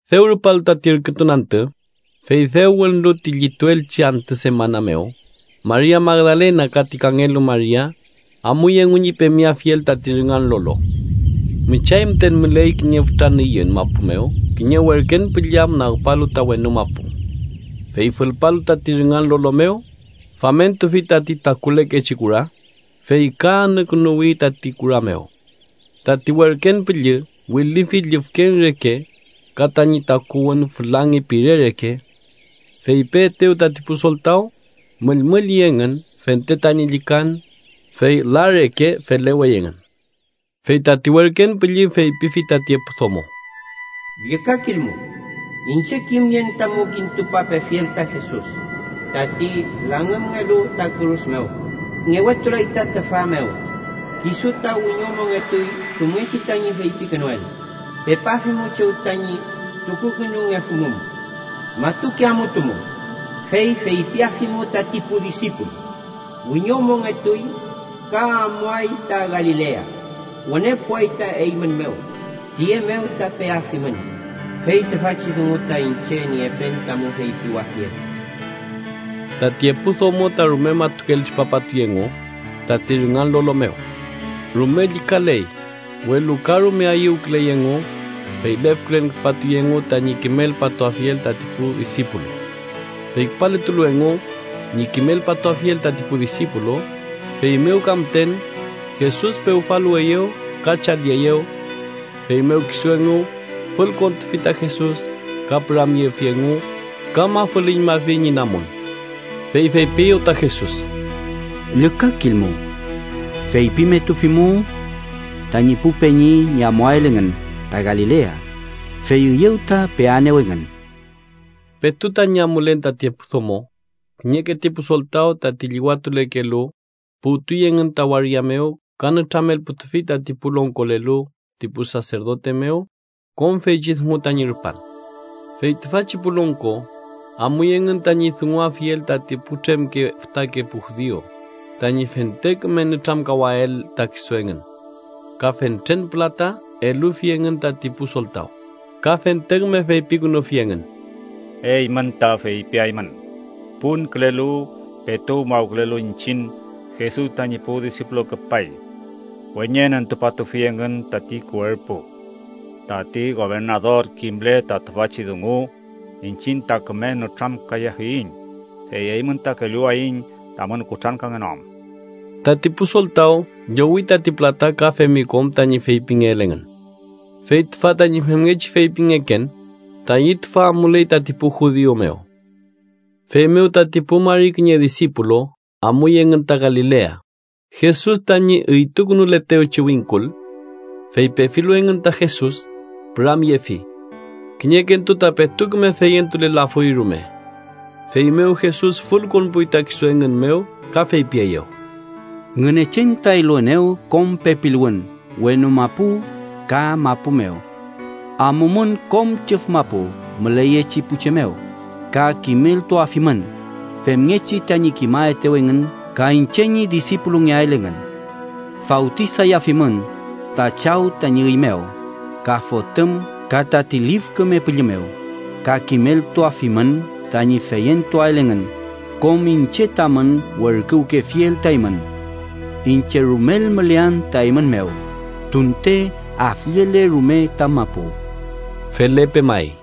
Dew rupalu tati ürkütun antü, fey dew wünlu ti llituelchi antü semana mew, Maria Magdalena ka tati kangelu Maria amuy engu ñi pemeafiel tati rüngan lolo. Müchay müten müley kiñe fütra nüyün mapu mew kiñe werken püllü am nagpalu ta wenu mapu. Fey fülpalu tati rüngan lolo mew, famentufi tati takulekechi kura, fey ka anükünuwi tati kura mew. Tati werken püllü wilüfi llüfkeñ reke, ka tañi takuwün fülangi pire reke. Fey peetew tati pu soltaw, müllmülli engün fente tañi llükan, fey la reke felewey engün. Fey tati werken püllü feypifi tati epu domo: —Llükakilmu. Iñche kimnien tamu kintupapefiel ta Jesus, tati langümngelu ta kürus mew. Ngewetulay ta tüfa mew. Kisu ta wiñomongetuy chumngechi tañi feypikünuel. Pepafimu chew tañi tukukünungefumum. Matuke amutumu, fey feypiafimu tati pu disipulu: ‘Wiñomongetuy, ka amuay ta Galilea. Wüne puway ta eymün mew. Tiye mew ta peafimün.’ Fey tüfachi dungu ta iñche niepen tamu feypiwafiel. Tati epu domo ta rume matukel tripapatuy engu tati rüngan lolo mew. Rume llükaley, welu ka rume ayüwküley engu, fey lefkülen küpatuy engu tañi kimelpatuafiel tati pu disipulu. Fey küpaletulu engu ñi kimelpatuafiel tati pu disipulu, feymew ka müten, Jesus pewfaluweyew ka chalieyew. Feymew kisu engu fülkontufi ta Jesus ka püramyefi engu ka mafülüñmafi ñi namun, fey feypieyew ta Jesus: —Llükakilmu. Feypimetufimu tañi pu peñi ñi amuael engün ta Galilea, fey üyew ta peaenew engün. Petu tañi amulen tati epu domo, kiñeke ti pu soltaw tati llüwatulekelu, puwtuy engün ta waria mew ka nütramelputufi tati pu longkolelu ti pu saserdote mew kom feychi dungu tañi rupan. Fey tüfachi pu longko amuy engün tañi dunguafiel tati putremke fütake pu judiu, tañi fente küme nütramkawael ta kisu engün. Ka fentren pülata elufi engün tati pu soltaw, ka fente küme feypikünufi engün: —Eymün ta feypiaymün: ‘Punkülelu, petu umawkülelu iñchiñ, Jesus tañi pu disipulu küpay. Weñenentupatufi engün tati kuerpu.’ Tati gobernador kimle ta tüfachi dungu, iñchiñ ta küme nütramkayafiyiñ, fey eymün ta kelluwayiñ tamün kutrankangenoam. Tati pu soltaw llowi tati pülata ka femi kom tañi feypingeel engün. Fey tüfa tañi femngechi feypingeken tayi tüfa amuley tati pu judiu mew. Feymew tati pu mari kiñe disipulu amuy engün ta Galilea, Jesus tañi üytukünuletewchi wingkul. Fey pefilu engün ta Jesus, püramyefi. Kiñekentu ta petu küme feyentulelafuy rume. Feymew Jesus fülkonpuy ta kisu engün mew ka feypieyew: —Ngünechen ta eluenew kom pepiluwün wenu mapu ka mapu mew. Amumün, kom chüf mapu müleyechi pu che mew. Ka kimeltuafimün femngechi tañi kimaetew engün ka iñche ñi disipulungeael engün. Fawtisayafimün ta Chaw tañi üy mew ka Fotüm ka tati Lif Küme Püllü mew, ka kimeltuafimün tañi feyentuael engün kom iñche tamün werküwkefiel ta eymün. Iñche rumel mülean ta eymün mew, tunte afllele rume ta mapu. Felepe may.